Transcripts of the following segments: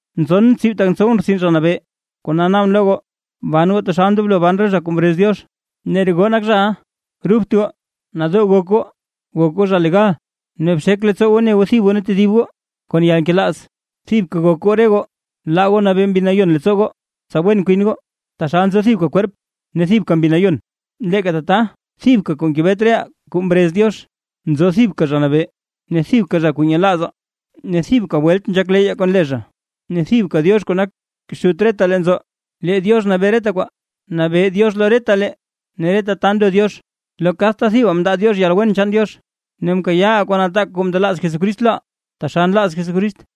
Nzon tsib tak ntsowʼn rtsin Zha Nabee, kona naabʼn lo goo; ban goo taxal ndoblo ban re zha kuu mrez Diox, ne re goo nak zhaʼa. Rubt goo, nadoo gok goo, gok goo zha legal, ne bxek leettsoo goo ne goo thib goo ne tedib goo kon yalnkelaaz. Thibka gok goo re goo, laa goo nabee Mbi Nayon leettsoo goo, tsa wen kwin goo. Taxal nzo thibka kwerp, ne thibka Mbi Nayon, leeka tata thibka kuu ngebet reʼaa kuu mrez Diox. Nzo thibka Zha Nabee, ne thibka zha kuu nyelaazaa, ne thibka welt nzhak leyyaa kon le zha, ne thibka Diox kuu nak Xut retalee nzo; lee Diox nabee reta kwaa, nabee Diox lo retalee ne reta ta ndo Diox. Lo kadta thibaa mndaa Diox yalwen chaan Diox, ne mkayaaʼaa kuu nataak kuu mndelaaz Jesucrist loʼaa taxal nlaaz Jesucrist.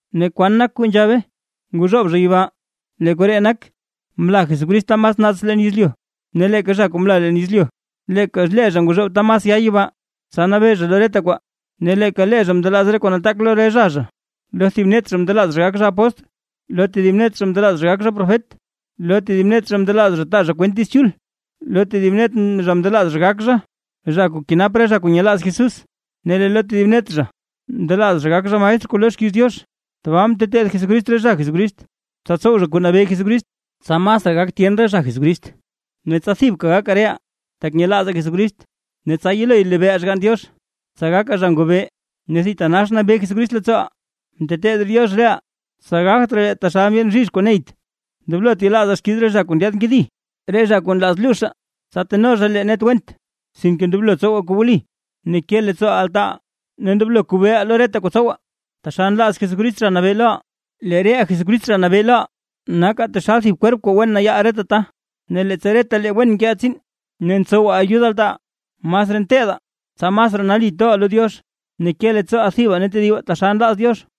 ¿Ne kwan nak kuu nzhabe: “Nguxoob zha yibaa”? Lee koree nak, mla Jesucrist ta mas naats leen yezlyu. Ne leeka zha kuu mla leen yezlyu, leeka lee zha nguxoob ta mas ya yibaa, tsa nabee zha lo reta kwaa. Ne leeka lee zha mndelaaz re kuu nataak lo re zha zha. Lo thib net zha mndelaaz zha gak zha apóstl, lo tedib net zha mndelaaz zha gak zha profet, lo tedib net zha mndelaaz zha taa zha kwent Diiz Chul, lo tedib net zha mndelaaz zha gak zha, zha kuu kenap re zha kuu nyelaaz Jesús, ne lee lo tedib net zha mndelaaz zha gak zha maestr kuu loo xkiiz Diox. Tbaa mteteed Jesucrist re zha Jesucrist, tsa tsow zha kuu nabee Jesucrist, tsa masraa gak tyen re zha Jesucrist, ne tsa thibka gakaa reʼaa tak nyelaazaa Jesucrist ne tsa yelo lebeeʼaa Xgann Diox, tsa gakaa zha ngobee ne thitanax nabee Jesucrist leettsooʼaa. Mteteed Diox reʼaa, tsa gagt raa lee taxal ndyeen bzhizh kuu neyt. Ndoblot yelaazaa xkiiz re zha kuu ndyaad nkedi, re zha kuu nlaaz luuzhaa; tsa teno zha lee net went. Sinke ndoblo tsowaa kuu wli ne ke leettsoo altaaʼaa, ne ndoblo kobeeʼaa lo reta kuu tsowaa taxal nlaaz Jesucrist Zha Nabee loʼaa. Lee reʼaa Jesucrist Zha Nabee loʼaa, nakaa taxal thib kwerp kuu wen nayaal reta ta. Ne leettsa retalee wen nkeʼaa tsiin ne tsowaa ayud altaaʼaa, masraa nteedaa, tsa masraa nali toʼaa lo Diox ne ke leettsooʼaa thibaa ne tedibaa taxal nlaaz Diox.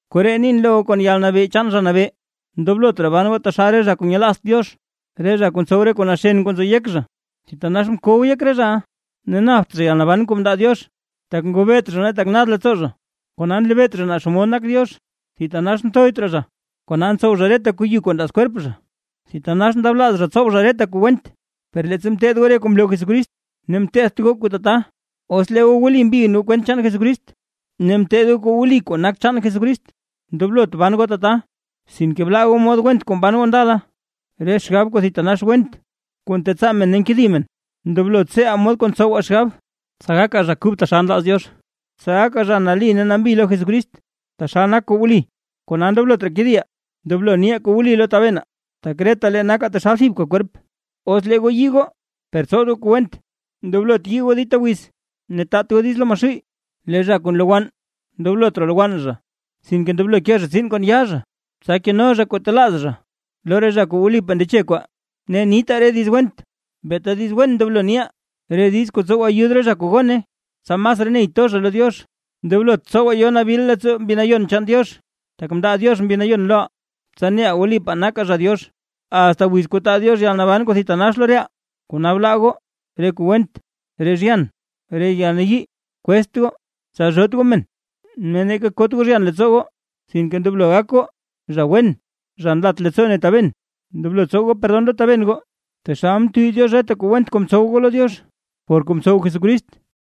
Koree nin lo goo kon yalnabee chaan Zha Nabee: Ndoblot raa ban goo taxal re zha kuu nyelaazt Diox, re zha kuu ntsow re kuu naxen kuu nzo yek zha, thitanax mkow yek re zha, ne napt zha yalnaban kuu ndaa Diox, tak ngobeet zha ne tak nad leettsoo zha, kona nlebeet zha naa xomod nak Diox. Thitanax nthoyt raa zha, kona ntsow zha reta kuu yu kuu nlaaz kwerp zha, thitanax ndablaaz zha ntsow zha reta kuu went. Per leettsa mteed goo re kuu mloo Jesucrist, mteedt goo kuu tata. Os lee goo wli mbin goo kwent chaan Jesucrist ne mteed goo kuu wli kuu nak chaan Jesucrist, ndoblot ban goo tata. Sinke blaa goo mod went kuu mban goo ndala, re xgab kuu thitanax went kuu ntetsaa men ne nkedi men. Ndoblo tseeʼaa mod kuu ntsowaa xgab, tsa gakaa zha kub taxal nlaaz Diox, ne tsa gakaa zha nali ne zha nambi lo Jesucrist taxal nak kuu wli. Kona ndoblot raa kediʼaa, ndoblo niʼaa kuu wli lo tabenaa, tak retalee nakaa taxal thibka kwerp. Os lee goo yii goo, per tsowt goo kuu went, ndoblot yii goo dita wiz, ne taat goo diiz lo Maxuuy. Lee zha kuu nlowann, ndoblot raa lowann zha, sinke ndoblo ke zha tsiin kon yaa zha, tsa keno zha kuu talaaz zha lo re zha kuu wlipaa ndeche kwaa. Ne niitaa re diiz went, beeta diiz wen ndoblo niʼaa, re diiz kuu tsow ayud re zha kuu gone, tsa masraa ney to zha lo Diox. Ndoblot tsowaa yo nabil leettsoo Mbi Nayon chaan Diox, tak mndaa Diox Mbi Nayon loʼaa, tsa neʼaa wlipaa nakaa zha Diox, asta wiz kuu taa Diox yalnaban kuu thitanax lo reʼaa. Kona bla goo: re kuu went, re zhyan, re yalnayii, kwezt goo, tsalzhoot goo men ne neeka kot goo zhyan leettsoo goo. Sinke ndoblo gak goo: zha wen, zha nlat leettsoo ne taben, ndoblo tsow goo perdon lo taben goo, taxal mtuuy Diox reta kuu went kuu mtsow goo lo Diox, por kuu mtsow Jesucrist.